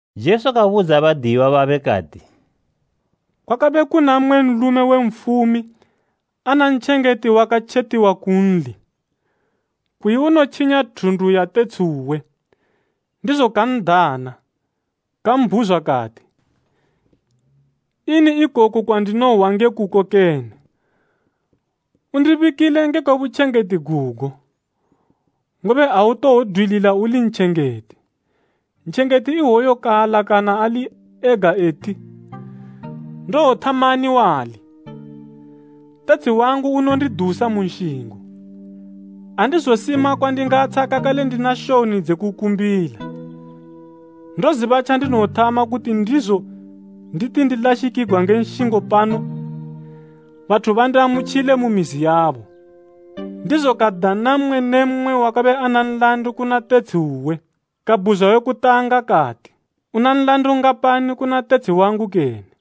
Jesu kabudza badiyiwa babe kati, “Kwakabe kuna mmwe nlume we nfumi ana ntjengeti wakatjetiwa kunli, kuyi unotjinya thundu ya tetshi uwe. Ndizo kan'dana, kambhuzwa kati, ‘Ini ikoku kwandinohwa nge kuko kene? Undibikile ngekwe butjengeti gugo, ngobe autowodwilila uli ntjengeti.’ Ntjengeti iwoyo kaalakana ali ega eti, ‘Ndowothamani wali? Tetshi wangu unondidusa mu nshingo. Andizosima kwandingatsha kakale ndina shoni dze kukumbila. Ndoziba tjandinowothama kuti ndizo nditi ndilashikigwa nge nshingo pano, bathu bandiamutjile mu mizi yabo.’ “Ndizo kadana mmwe ne mmwe wakabe ana nlandu kuna tetshi uwe. Kabhuzwa we kutanga kati, ‘Una nlandu ngapani kuna tetshi wangu kene?’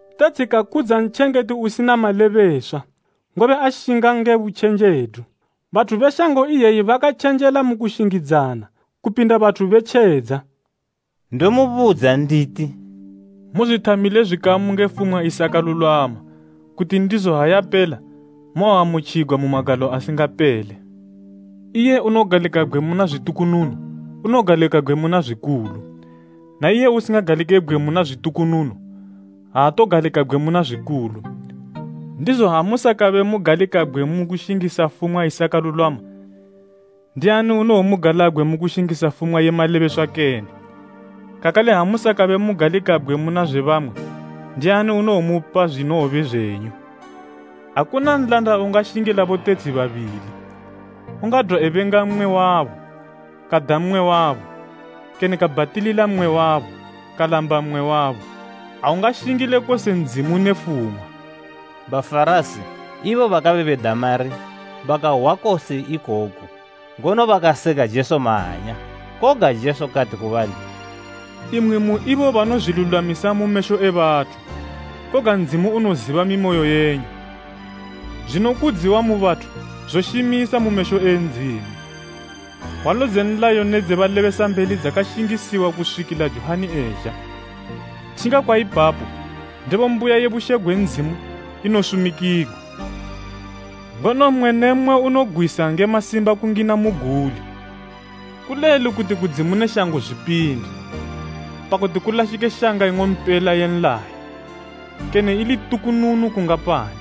“Tetshi kakudza ntjengeti usina malebeswa, ngobe ashinga nge butjenjedu. Bathu be shango iyeyi bakatjenjela mu kushingidzana, kupinda bathu be tjedza.” Ndomubudza nditi, “Muzwithamile zwikamu nge fumwa isakalulwama, kuti ndizo ha yapela mowoamutjigwa mu magalo asingapele. Iye unogalikabgwe muna zwitukununu unogalikabgwe muna zwikulu, na iye usingagalikebgwe muna zwitukununu, aatogalikabgwe muna zwikulu. Ndizo ha musakabe mugalikabgwe mu kushingisa fumwa isakalulwama, ndiani unowomugalabgwe mu kushingisa fumwa ye malebeswa kene? Kakale ha musakabe mugalikabgwe muna zwe bamwe, ndiani unowomupa zwinowobe zwenyu. “Akuna nlanda ungashingila botetshi babili. Ungadwa ebenga mmwe wabo, kada mmwe wabo, kene kabhatilila mmwe wabo, kalamba mmwe wabo. Aungashingile kose Ndzimu ne fumwa.” Bafarasi, ibo bakabe beda mari bakahwa kose ikoku, ngono bakaseka Jesu mahanya. Koga Jesu kati ku bali, “Imwi mu ibo banozwilulwamisa mu mesho e bathu, koga Ndzimu unoziba mimoyo yenyu, zwinokudziwa mu bathu zoshimisa mu mesho e Ndzimu. “Hwalo dze nlayo ne dze balebesambeli dzakashingisiwa kuswikila Johani ezha. Tjinga kwa ipapo, ndebo mbuya ye bushe gwe Ndzimu inosumikigwa, ngono mmwe ne mmwe unogwisa nge masimba kungina muguli. Kulelu kuti kudzimu ne shango zwipinde, pakuti kulashike shanga ing'ompela ye nlayo, kene ili tukununu kungapani.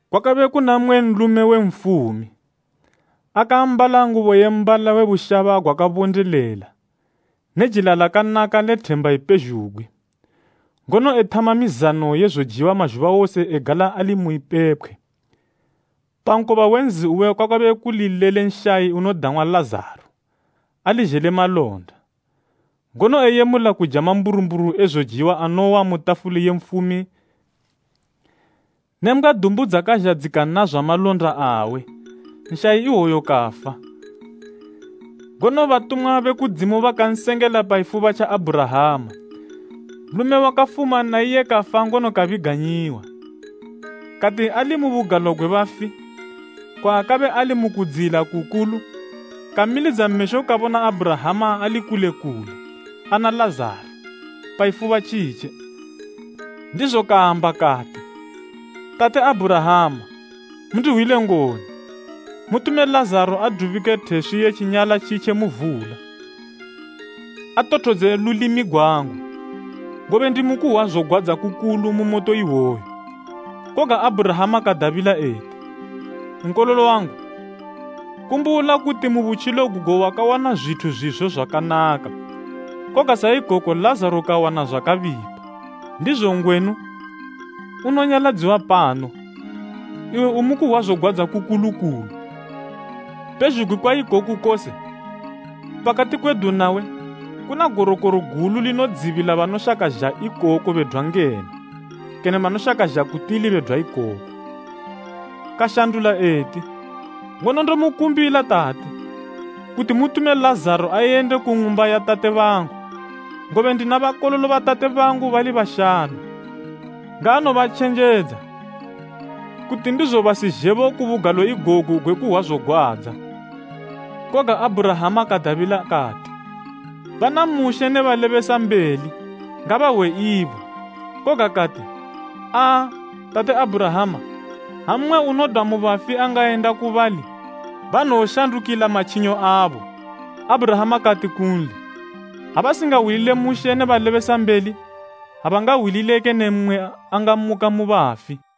“Kwakabe kuna mmwe nlume we nfumi, akaambala ngubo ye mbala we bushaba gwakabondelela ne jila lakanaka le themba ipezhugwi, ngono ethama mizano ye zojiwa mazhuba wose egala ali mu ipepkhwe. Pa nkoba we nzi uwe kwakabe kuli lele nshayi unodang'wa Lazaro, ali zhele malonda, ngono eyemula kuja mamburumburu e zojiwa anowa mu tafuli ye nfumi ne mbgwa dumbu dzakazha dzikanazwa malonda awe. “Nshayi iwoyo kafa, ngono batumwa be kudzimu bakansengela pa ifuba tja Abhurahama. Nlume wakafuma na iye kafa ngono kabiganyiwa. Kati ali mu bugalo gwe bafi, kwaakabe ali mu kudziyila kukulu, kamilidza mesho kabona Abhurahama ali kule kule, ana Lazaro, pa ifuba tjitje. Ndizo kamba kati, ‘Tate Abhurahama, mundihwile ngoni, mutume Lazaro adubike theswi ye tjinyala tjitje mu vula, atothodze lulimi gwangu, ngobe ndimu kuhwa zogwadza kukulu mu moto iwoyu.’ “Koga Abhurahama kadabila eti, ‘Nkololo wangu, kumbula kuti mu butjilo gugo wakawana zwithu zwizo zwakanaka, koga sa ikoko Lazaro kawana zwakabipa, ndizo ngwenu, unonyaladziwa pano, iwe umu kuhwa zogwadza kukulu kulu. Pezhugwi kwa ikoku kose, pakati kwedu nawe, kuna gorokoro gulu linodzibila banoshaka zha ikoko bedwa ngeno, kene banoshaka zha ku tili bedwa ikoko.’ Kashandula eti, ‘Ngono ndomukumbila tate, kuti mutume Lazaro, ayende ku ng'umba ya tate bangu, ngobe ndina bakololo ba tate bangu bali bashanu. Ngaanobatjenjedza, kuti ndizo basizhebo ku bugalo igogu gwe kuhwa zogwadza.’ “Koga Abhurahama kadabila kati, ‘Bana Mushe ne balebesambeli ngabahwe ibo.’ Koga kati, ‘Aa, Tate Abhurahama, ha mmwe unodwa mu bafi angayenda ku bali, banowoshandukila matjinyo abo.’ Abhurahama kati kunli, ‘Ha basingahwilile Mushe ne balebesambeli, abangahwilile kene mmwe angamuka mu bafi.’”